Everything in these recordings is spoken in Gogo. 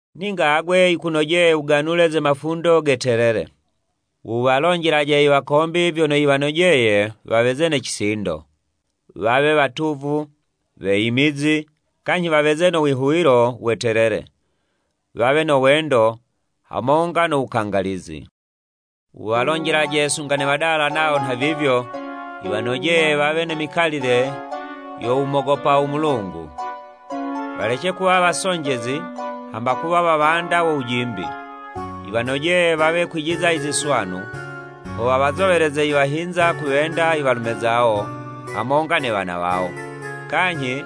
Ninga agwe yikunojeye wuganule ze mafundo ge telele. Wuwalonjelaje i wakombi vyono yiwanojeye waweze ne cisindo, wawe watuvu, weyimizi, kanyhi waweze no wihuwilo we telele, wawe no wendo hamonga no wukangalizi. Wuwalonjelaje sunga ne wadala nawo nhavivyo yiwanojeye wawe ne mikalile yo wumogopa u Mulungu, walece kuwa wasonjezi hamba kuwa wawanda wo wujimbi. Yiwanojeye wawe kwijiza i ziswanu, ho wawazoweleze i wahinza kuwenda i walume zawo hamonga ne wana wawo, kanyhi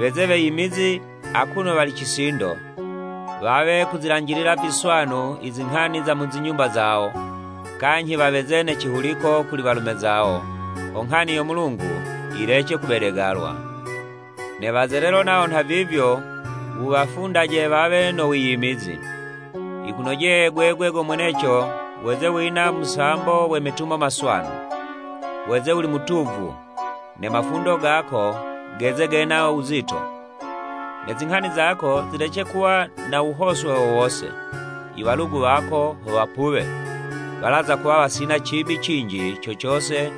weze weyimizi akuno wali cisindo, wawe kuzilanjilila viswanu i zinghani za mu zinyumba zawo, kanyhi waweze ne cihuliko kuli walume zawo, ho nghani yo Mulungu yilece kubedegalwa. Ne wazelelo nawo nha vivyo, wuwafundaje wawe no wiyimizi. Yikunojeye gwegwe go mweneco weze wina musambo we metumo maswanu. Weze wuli mutuvu, ne mafundo gako geze gena wuzito. Ne zinghani zako zilece kuwa na wuhoswe wo wose, i walugu wako ho wapuwe, walaza kuwa wasina cibi cinji co cose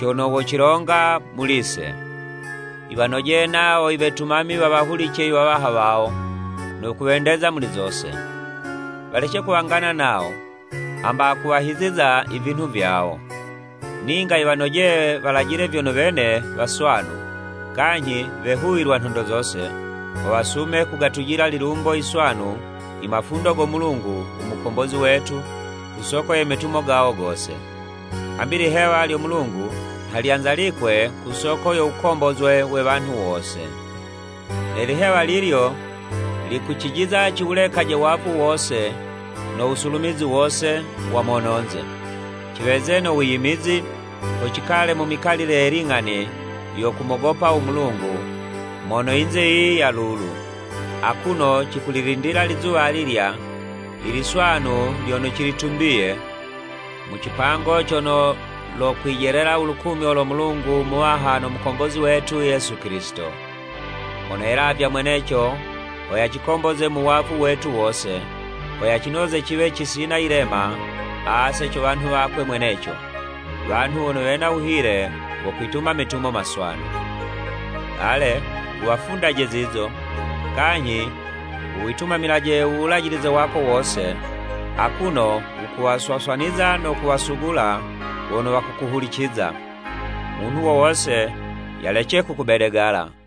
cono wocilonga muli'se. Yiwanojeye nawo i wetumami wawahulice iwawaha wawo, no kuwendeza muli zose. Walece kuwangana nawo, hamba kuwahiziza i vinhu vyawo. Ninga yiwanojeye walajile vyono wene waswanu, kanyhi wehuwilwa nhondo zose, ho wasume kugatujila lilumbo yiswanu i mafundo go Mulungu u Mukombozi wetu ku soko ye metumo gawo gose. Hambi ilihewa lyo Mulungu nha lyanzalikwe ku soko yo wukombozwe we wanhu wose. Ne lihewa lilyo likucijiza ciwulekaje wavu wose no wusulumizi wose wa mononze, ciweze no wiyimizi, ho cikale mu mikalile ye ling'ani yo kumogopa u Mulungu mono yinze yiyi ya lulu, akuno cikulilindila lizuwa alilya i liswanu lyono cilitumbiye, mu cipango cono lokwijelela u lukumyo lo Mulungu Muwaha no Mukombozi wetu Yesu Kilisito. Mono yelavya mweneco ho yacikomboze mu wavu wetu wose, ho yacinoze ciwe cisina yilema ase co wanhu wakwe mweneco, wanhu wono wena wuhile wo kwituma metumo maswanu. Ale, wuwafundaje zizo, kanyhi wuwitumamilaje u wulajilize wako wose, akuno wukuwaswaswaniza no kuwasugula wono wakukuhuliciza. Munhu wo wose yalece kukubedegala.